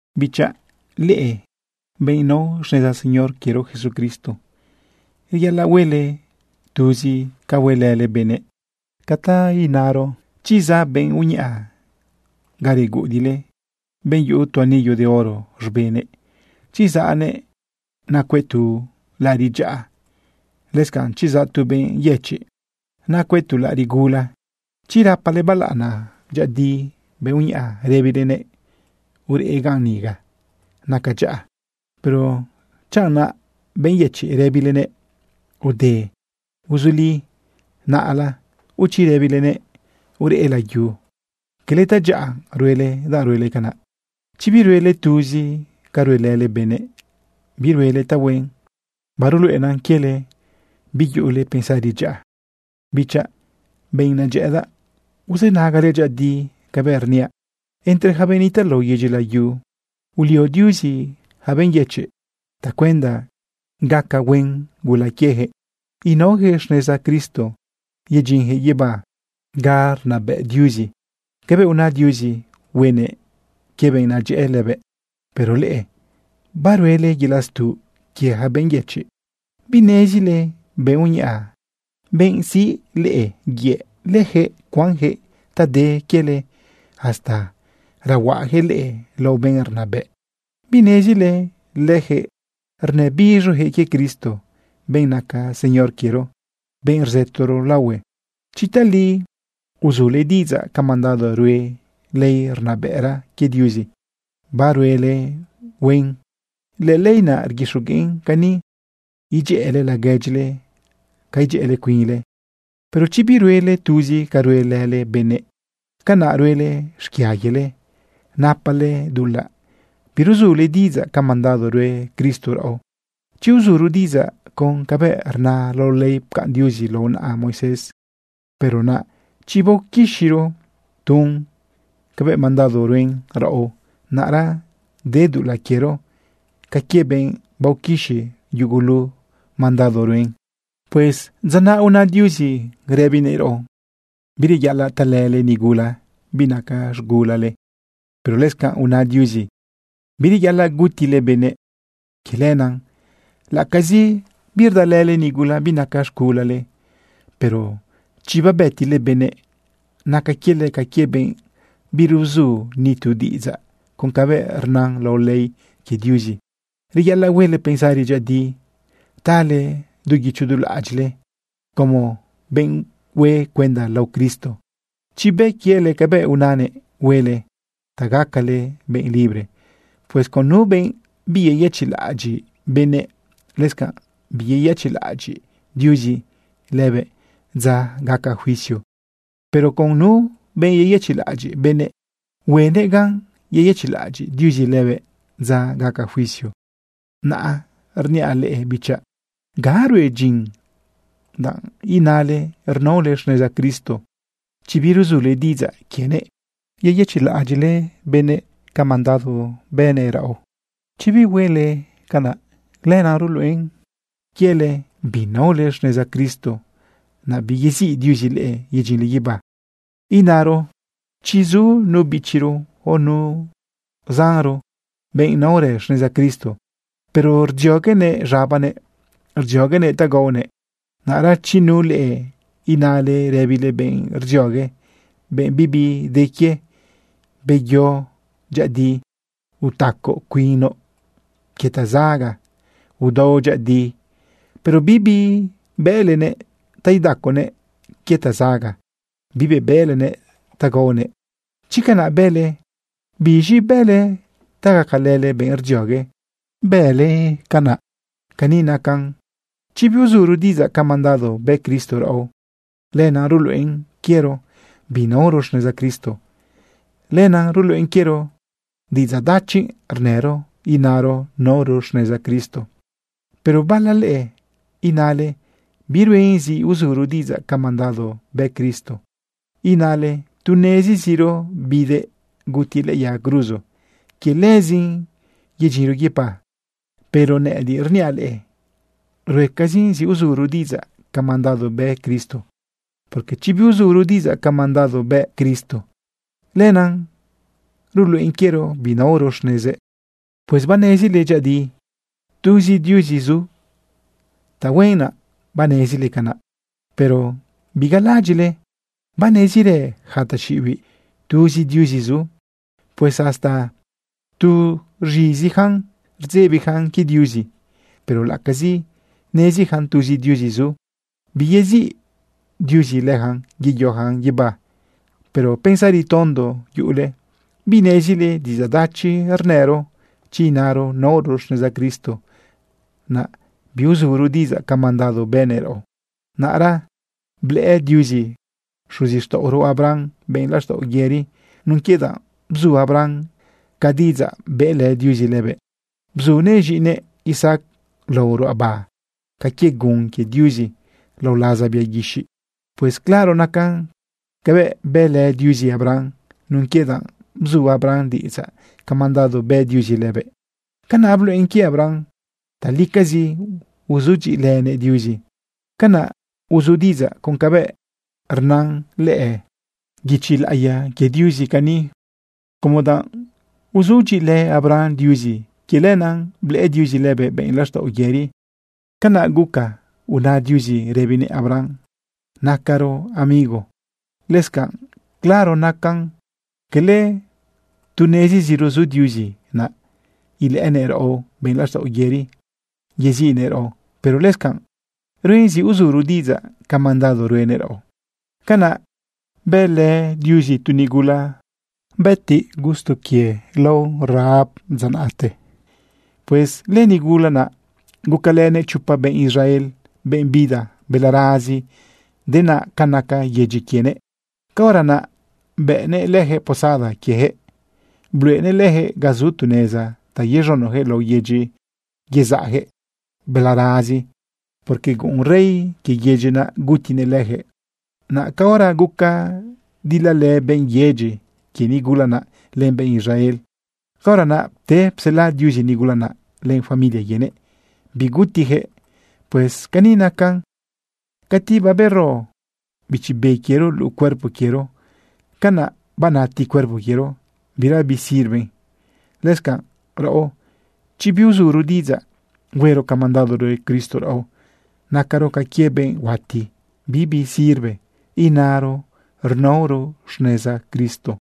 Bichaꞌ, leꞌe benꞌ nao xneza Señor quiero Jesucristo, reyaꞌalaꞌ huele tuzi ca huelële benëꞌ. Por ejemplo, chi zaꞌ benꞌ uñaꞌa ga reguꞌudiꞌle, benꞌ yuꞌu tu anillo de oro z̃benëꞌ, chi zaꞌnëꞌ nacuëꞌ tu laꞌariꞌ dyaꞌa, lëscanꞌ chi zaꞌ tu benꞌ yëchiꞌ nacuëꞌ tu laꞌariꞌ gula, chi rapale balaꞌana dyëꞌëdi benꞌ uñaꞌa rëbilenëꞌ: “Ureꞌ ganꞌ ni ga naca dyaꞌa”, pero chanꞌ naꞌ benꞌ yëchiꞌ rëbilenëꞌ: “Ude uzuli naꞌla”, o chi rëbilenëꞌ: “Ureꞌ layu”, cala tadyaꞌa ruele danꞌ ruele canaꞌ. Chi biruele tuzi ca ruelële benëꞌ, biruele tahuen. Baruluꞌena quiele biyuꞌule pensari dyaꞌa. Bichaꞌ, benꞌ nedyëꞌëdaꞌ, uzënagale dyëꞌëdi cabëꞌ rniaꞌ: Entre yaca benꞌ nitaꞌ lao yedyi layu, ulio Diuzi yaca benꞌ yëchiꞌ tacuenda gaca huen gula quiejëꞌ inaojëꞌ xneza Cristo yedyinjëꞌ guibá ga rnabëꞌ Diuzi cabëꞌ una Diuzi huenëꞌ quie benꞌ nadyëꞌë lëbëꞌ. Pero leꞌe baruele yelaꞌ stuꞌ quie yaca benꞌ yëchiꞌ. ¿Binezile benꞌ uñaꞌa, benꞌ siꞌ leꞌe yëꞌ, lëjëꞌ cuanjëꞌ ta de quiele hasta rehuaꞌajëꞌ leꞌe lao benꞌ rnabëꞌ? ¿Binezile leyaquëꞌ rnëbiz̃oyaquëꞌ quie Cristo, benꞌ naca Señor quiero, benꞌ rzëtoro laohue? Chi tali uzule diꞌidzaꞌ ca mandado rue ley rnabëꞌra quie Diuzi, baruele huen. Lëley naꞌ rguixogueꞌn cani: “Idyëꞌële laguedyile ca idyëꞌële cuinle.” Pero chi biruele tuzi ca ruelële benëꞌ, canaꞌ ruele xquia quiele, napale dulaꞌ biruzule diꞌidzaꞌ ca mandado rue Cristo raꞌo. Chi uzuro diꞌidzaꞌ con cabëꞌ rna lao ley pcaꞌn Diuzi lao naꞌa Moisés, pero naꞌa chi baoquixiro tun cabëꞌ mandado ruen raꞌo, naꞌra de dulaꞌ quiero ca quie benꞌ baoquixi yugulu mandado ruen. Pues dza naꞌ una Diuzi rëbinëꞌ raꞌo: “Bireyaꞌalaꞌ talële nigula binaca z̃gulale”, pero lëscanꞌ una Diuzi: “Bireyaꞌalaꞌ gutile benëꞌ.” Quie lenaꞌ laꞌacazi birdalële nigula binaca z̃gulale, pero chi babëtile benëꞌ, naca quiele ca quie benꞌ biruzu ni tu diꞌidzaꞌ con cabëꞌ rna lao ley quie Diuzi. Reyaꞌalaꞌ huele pensari dyëꞌëdi tale du guicho du laꞌadyiꞌle como benꞌ hue cuenda lao Cristo chi bë quiele cabëꞌ unanëꞌ huele ta gacale benꞌ libre. Pues con nu benꞌ biyeyëchiꞌlaꞌadyiꞌ benëꞌ, lëscanꞌ biyeyëchiꞌlaꞌadyiꞌ Diuzi lëbëꞌ dza gaca juicio. Pero con nu benꞌ beyëchiꞌlaꞌadyiꞌ benëꞌ, huenëꞌ gan yeyëchiꞌlaꞌadyiꞌ Diuzi lëbëꞌ dza gaca juicio. Naꞌ rniaꞌ leꞌe bichaꞌ: ¿Ga rue dyin danꞌ inale rnaole xneza Cristo, chi biruzule diꞌidzaꞌ quienëꞌ yeyëchiꞌlaꞌadyiꞌle benëꞌ ca mandado bënëꞌ quiero? Chi huele canaꞌ, lenaꞌ ruluꞌen quiele binaole xneza Cristo, naꞌ biyeziꞌ Diuzi leꞌe yedyinle guibá. Inaro chi zu nu bichiro, o nu zanro, benꞌ naorë xneza Cristo, pero rdzioguenëꞌ z̃abanëꞌ, rdzioguenëꞌ ta gaonëꞌ, naꞌra chi nu leꞌe inale rëbile benꞌ rdziogue, benꞌ bibi de quie: “Beyo dyëꞌëdi. Utacoꞌ cuinoꞌ quie tazaga. Udao dyëꞌëdi”, pero bibi bëꞌlenëꞌ ta idaconëꞌ quie tazaga, bibi bëꞌlenëꞌ ta gaonëꞌ, chi canaꞌ bële, ¿biz̃i bële ta gacalële benꞌ rdziogue, bële canaꞌ? Cani nacan: Chi biuzuro diꞌidzaꞌ ca mandado bë Cristo raꞌo, lenaꞌ ruluꞌen quiero binaoro xneza Cristo, lenaꞌ ruluꞌen quiero diꞌidzaꞌ dachi rnëro inaro naoro xneza Cristo. Pero bala leꞌe inale biruen zi uzuro diꞌidzaꞌ ca mandado bë Cristo. Inale tu neziziro bidëꞌ gutiëꞌ lëꞌë yaga cruzo, quie lëzin yedyinro guibá. Pero nëꞌëdiꞌ rniaꞌ leꞌe, ruecazin zi uzuro diꞌidzaꞌ ca mandado bë Cristo, porque chi biuzuro diꞌidzaꞌ ca mandado bë Cristo, lenaꞌ ruluꞌen quiero binaoro xnezëꞌ. Pues banezile dyëꞌëdi tuzi Diuzi zu. Tahuen naꞌ banezile canaꞌ. Pero bigalaꞌadyiꞌle banezirë yaca taxiꞌibiꞌ tuzi Diuzi zu. Pues hasta tu rz̃iziyacan rdzebiyacan quie Diuzi. Pero laꞌacazi neziyacan tuzi Diuzi zu, biyeziꞌ Diuzi leyacan yeyoyacan guibá. Pero pensari tondo yuꞌule. ¿Binezile diꞌidzaꞌ dachi rnëro chi inaro naoro xneza Cristo, naꞌ biuzuro diꞌidzaꞌ ca mandado bënëꞌ raꞌo? Naꞌra blëꞌë Diuzi xuzixtaꞌoro Abraham benꞌ laxtaꞌo yëri nun quie danꞌ bzu Abraham ca diꞌidzaꞌ bëꞌlë Diuzi lëbëꞌ. Bzunëꞌ z̃iꞌinëꞌ Isaac lao ruꞌaba ca quie gun quie Diuzi lao laza bia guixiꞌ. Pues claro nacan cabëꞌ bëlë Diuzi Abraham. Nun quie danꞌ bzu Abraham diꞌidzaꞌ ca mandado bë Diuzi lëbëꞌ, canaꞌ bluꞌen quie Abraham talicazi uzudyiꞌilënëꞌ Diuzi. Canaꞌ uzu diꞌidzaꞌ con cabëꞌ rna lëꞌë guichi laꞌiya quie Diuzi cani: “Como danꞌ uzudyiꞌilë Abraham Diuzi, quie lenaꞌ blëꞌë Diuzi lëbëꞌ benꞌ laxtaꞌo yëri.” Canaꞌ guca una Diuzi rëbinëꞌ Abraham: “Nacaro amigo.” Lëscanꞌ, claro nacan cala tu neziziro zu Diuzi, naꞌ ilëꞌënëꞌ raꞌo benꞌ laxtaꞌo yëri, yeziꞌnëꞌ raꞌo. Pero lëscanꞌ ruen zi uzuro diꞌidzaꞌ ca mandado ruenëꞌ raꞌo. Canaꞌ bëlë Diuzi tu nigula gutiꞌ gusto quie lao Rahab dza naꞌte. Pues lënigula naꞌ gucalënëꞌ chopa benꞌ Israel, benꞌ bida balarazi denaꞌ ca naca yedyi quienëꞌ. Caora naꞌ bëꞌneꞌ lëjëꞌ posada quiejëꞌ. Bluꞌenëꞌ leyaquëꞌ ga zu neza ta yez̃unoyaquëꞌ lao yedyi yezaꞌjëꞌ balarazi, porque guꞌun rey quie yedyi naꞌ gutinëꞌ lëjëꞌ. Naꞌ caora guca dilalë benꞌ yedyi quie nigula naꞌ, len benꞌ Israel, caora naꞌ pte psela Diuzi nigula naꞌ len familia quienëꞌ, bigutiyaquëꞌ. Pues cani nacan: Cati babero bichi be quiero luꞌu cuerpo quiero, canaꞌ banati cuerpo quiero, bira bisirve. Lëscanꞌ raꞌo, chi biuzuro diꞌidzaꞌ huero ca mandado rue Cristo raꞌo, nacaro ca quie benꞌ huati, bibi sirve inaro rnaoro xneza Cristo.